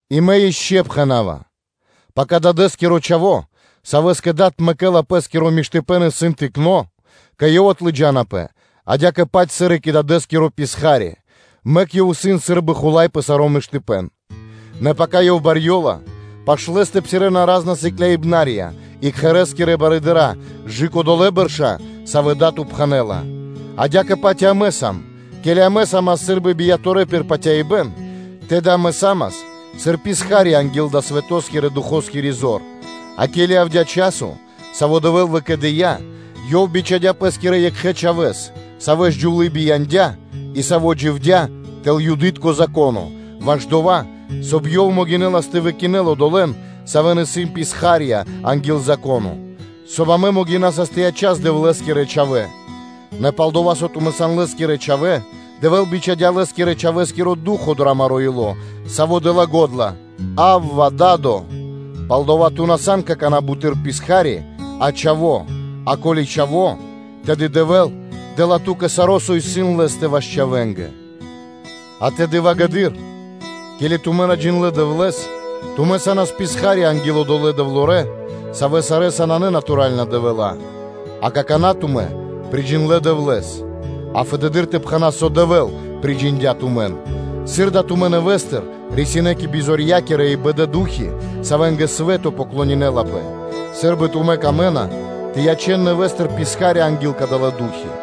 И мэ ишчо (инкэ́) пхэна́ва: пака дадэ́скиро чхаво́, савэ́скэ дад мэкэ́ла пэ́скиро миштыпэ́н, исын тыкно́, кэ ёв отлыджанапэ адя́кэ-паць сыр и кэ дадэ́скиро писха́ри, мэк ёв исын сы́рбы хула́й пэ саро́ миштыпэ́н; нэ пака ёв барьёла, пашы́л лэ́стэ псирэ́на ра́зна хулаибнытка и кхэрэ́скирэ барыдыра́ кэ/жы́ко кэ долэ́ бэрша́, савэ́ дад упхэнэла. Адя́кэ-паць и амэ сам, ке́ли амэ са́мас сы́рбы бияторэ пир патяибэ́н, тэды амэ са́мас сыр писха́рья анги́л далэ́ свэто́скирэ – духоскири зор; а ке́ли явдя́ часо, саво́ Дэвэ́л выкэдыя́, Ёв бичхадя́ Пэ́скирэ Екхэ Чхавэ́с, Савэс джувлы́ бияндя́ и Саво́ дживдя́ тэл Юды́тко Зако́но, ваш дова́, соб (кай) Ёв могинэлас тэ выкинэл одолэ́н, савэ́ исын писха́рья анги́л Зако́но, соб (кай) амэ могинасас тэ ячас Дэвлэ́скирэ чхавэ́нца. Нэ пал-дова́, со тумэ́ сан Лэ́скирэ чхавэ́, Дэвэ́л бичхадя́ Лэ́скирэ-Чхавэ́скиро Ду́хо (Фа́но) дро амаро́ ило́, Саво́ дэ́ла го́дла: “Авва! Да́до!” Палдава́ ту на сан какана́ буты́р писха́ри, а чхаво́, а ко́ли чхаво́, тэды Дэвэ́л дэ́ла ту́кэ саро́, со исын Лэ́стэ ваш чхавэ́нгэ. А тэды, ґарэдыр (вагэдыр), ке́ли тумэ́ на джиндлэ́ Дэвлэ́с, тумэ́ са́нас писха́рья анги́л одолэ́ дэвлорэндэ, савэ́ сарэ́са нанэ натуралэ дэвэла́; а какана́ тумэ́ приджиндлэ Дэвлэ́с, а фэды́р тэ пхэнас, со Дэвэ́л приджиндя тумэн; сыр дава́ тумэ́ нэвэ́стыр рисинэ́ кэ бизорья́кирэ и бэда ду́хи, савэ́нгэ свэ́то поклонинэлапэ, сы́рбы тумэ́ камэ́на тэ ячэн нэвэ́стыр писхарье́нца анги́л кадалэ́ ду́хи.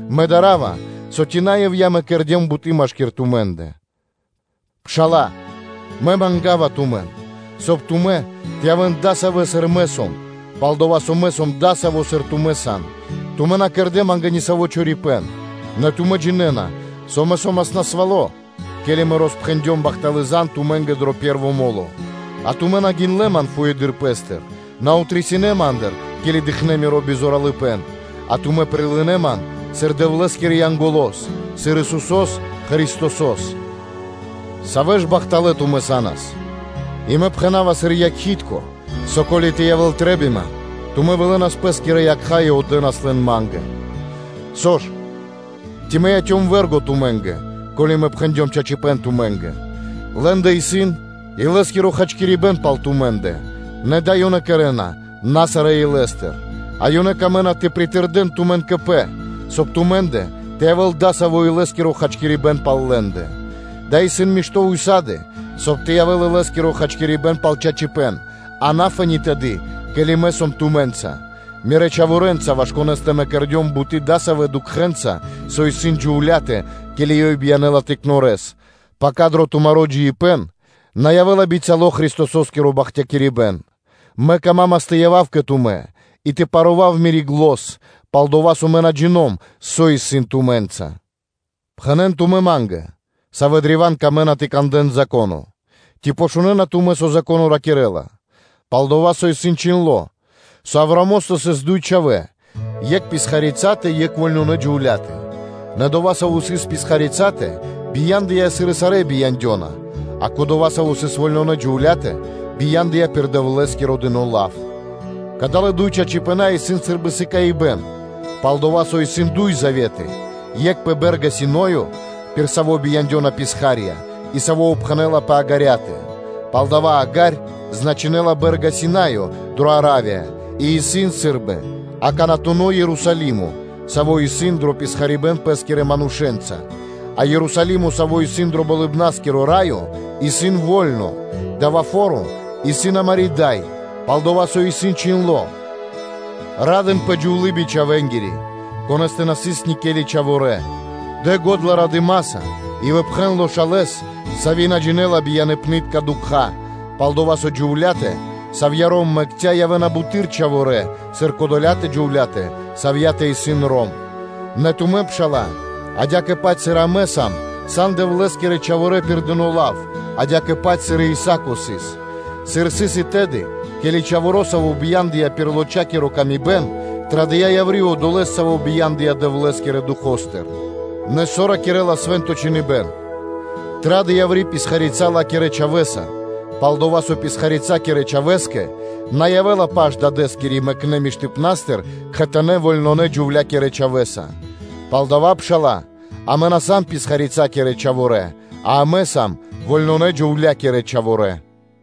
Мэ дарава, со ци на ивья́ (напра́снэс) мэ кэрдём буты́ машки́р тумэ́ндэ. Пшала́лэ! Мэ манга́ва тумэн, соб (кай) тумэ́ тэ явэ́н дасавэ́, сыр мэ сом, пал-дова́ со мэ сом дасаво, сыр тумэ́ сан: тумэ́ на кэрдэ́ ма́нгэ ни саво́ чорипэ́н. Нэ тумэ́ джинэ́на, со мэ со́мас насвало́, ке́ли мэ роспхэндём бахталы́ зан (звесь) тумэ́нгэ дро пэ́рво мо́ло, а тумэ́ на гиндлэ́ ман фуеды́р пэ́стыр, на рисинэ́ ма́ндыр, ке́ли дыкхнэ́ миро бизоралыпэн, а тумэ́ прилынэ́ ман сыр Дэвлэ́скирэ Янголо́с, сыр Исусо́с Христосо́с. Савэ ж бахталэ́ тумэ́ са́нас! И мэ пхэна́ва сыр якхи́тко (свидетелё), со ко́ли тэ явэ́л трэ́бима, тумэ́ вылэнас пэ́скирэ якха́ и отдэнас лэн ма́нгэ. Со ж, ци мэ яцём вэргоса тумэ́нгэ, ко́ли мэ пхэндём чачипэ́н тумэ́нгэ? Лэ́ндэ исын илэ́скиро хачкирибэ́н пал тумэ́ндэ, нэ дава́ ёнэ кэрэ́на на сарэ́ илэ́стыр, а ёнэ камэ́на тэ пиритырдэн тумэн кэ пэ, соб (кай) тумэ́ндэ тэ явэ́л дасаво илэ́скиро хачкирибэ́н пал лэ́ндэ. Дава́ исын мишто́ ўса́ды (сак), соб (кай) тэ явэ́л илэ́скиро хачкирибэ́н пал чачипэ́н, а на фэ́ни тэды, ке́ли мэ сом тумэ́нца, мирэ́ чхаворэнца, ваш конэ́скэ мэ кэрдём буты́ дасавэ́ дукхэнца, со исын джувля́тэ, ке́ли ёй биянэ́ла тыкнорэс, пака дро тумаро́ джиибэ́н на явэ́ла бицяло́ Христосо́скиро бахтякирибэ́н: мэ камамас тэ явав кэ тумэ́ и тэ парував мири́ зан, пал-дова́ со мэ на джиндём, со сыс тумэ́нца. Пхэнэ́н тумэ́ ма́нгэ, савэ́ древа́н камэ́на тэ кандэ́н Зако́но: ци шунэ́на тумэ́, со Зако́но ракирэ́ла? Пал-дова́ со исын чхиндло́, со Авраамостэ сыс дуй чхавэ́, екх писхарицатэ, екх вольнонэ джувля́тэ. Нэ одова́, саво́ сыс писхарицатэ, бия́ндыя, сыр и сарэ́ бияндёна, а кодова́, саво́ сыс вольнонэ джувля́тэ, бия́ндыя пир Дэвлэ́скиро дыно́ лав. Кадалэ́ дуй чачипэна́ исын сы́рбы сыкаибэ́н: пал-дова́ со исын дуй заветы – екх пэ Бэ́рга Синаё, пир саво́ бияндёна писха́рья и саво́ упхэнэла пэ Агарьятэ. Палдава́ Агарь значинэла Бэ́рга Синаё дрэ Аравия и исын сы́рбы аканатуно Ерусалимо, саво́ исын дро писхарибэн пэ́скирэ манушэ́нца, а Ерусалимо, саво́ исын дро Болыбна́скиро Раё исын во́льно, – дава́ фо́ро исын амари́ дай. Пал-дова́ со исын чхиндло́: “Ра́дынпэ, джувлие бичхавэнгири, конэ́стэ на сыс никели чхаворэ́; дэ го́дла радыма́са и выпхэн лошалэс (весёлэс), сави́ на джинэ́ла бияныпнытка дукха́; пал-дова́ со джувля́тэ, савья́ ром мэкця́, явэ́на бутэды́р чхаворэ́, сыр кодолятэ джувля́тэ, савьятэ исын ром.” Нэ тумэ́, пшала́лэ, адя́кэ-паць сыр и амэ сам, сан Дэвлэ́скирэ чхаворэ́ пир дыно́ лав, адя́кэ-паць сыр и Исаа́ко сыс. Сыр сыс и тэды, ке́ли чхаворо́, саво́ бия́ндыя пир лочакиро камибэн, традыя́ яври́ одолэ́с, саво́ бия́ндыя Дэвлэ́скирэ Духо́стыр. Нэ со ракирэ́ла Свэ́нто Чхиныбэ́н? “Вытрадэ писхарица ла́кирэ чхавэ́са, пал-дова́ со писхарицакирэ чхавэ́скэ на явэ́ла паш Дадэ́скирэ мэкнэ́ миштыпна́стыр кхэтанэ́ вольнонэ – джувлякирэ чхавэ́са.” Палдава́, пшала́лэ, амэ на сам писхарицакирэ чхаворэ́, а амэ сам вольнонэ-джувлякирэ чхаворэ́.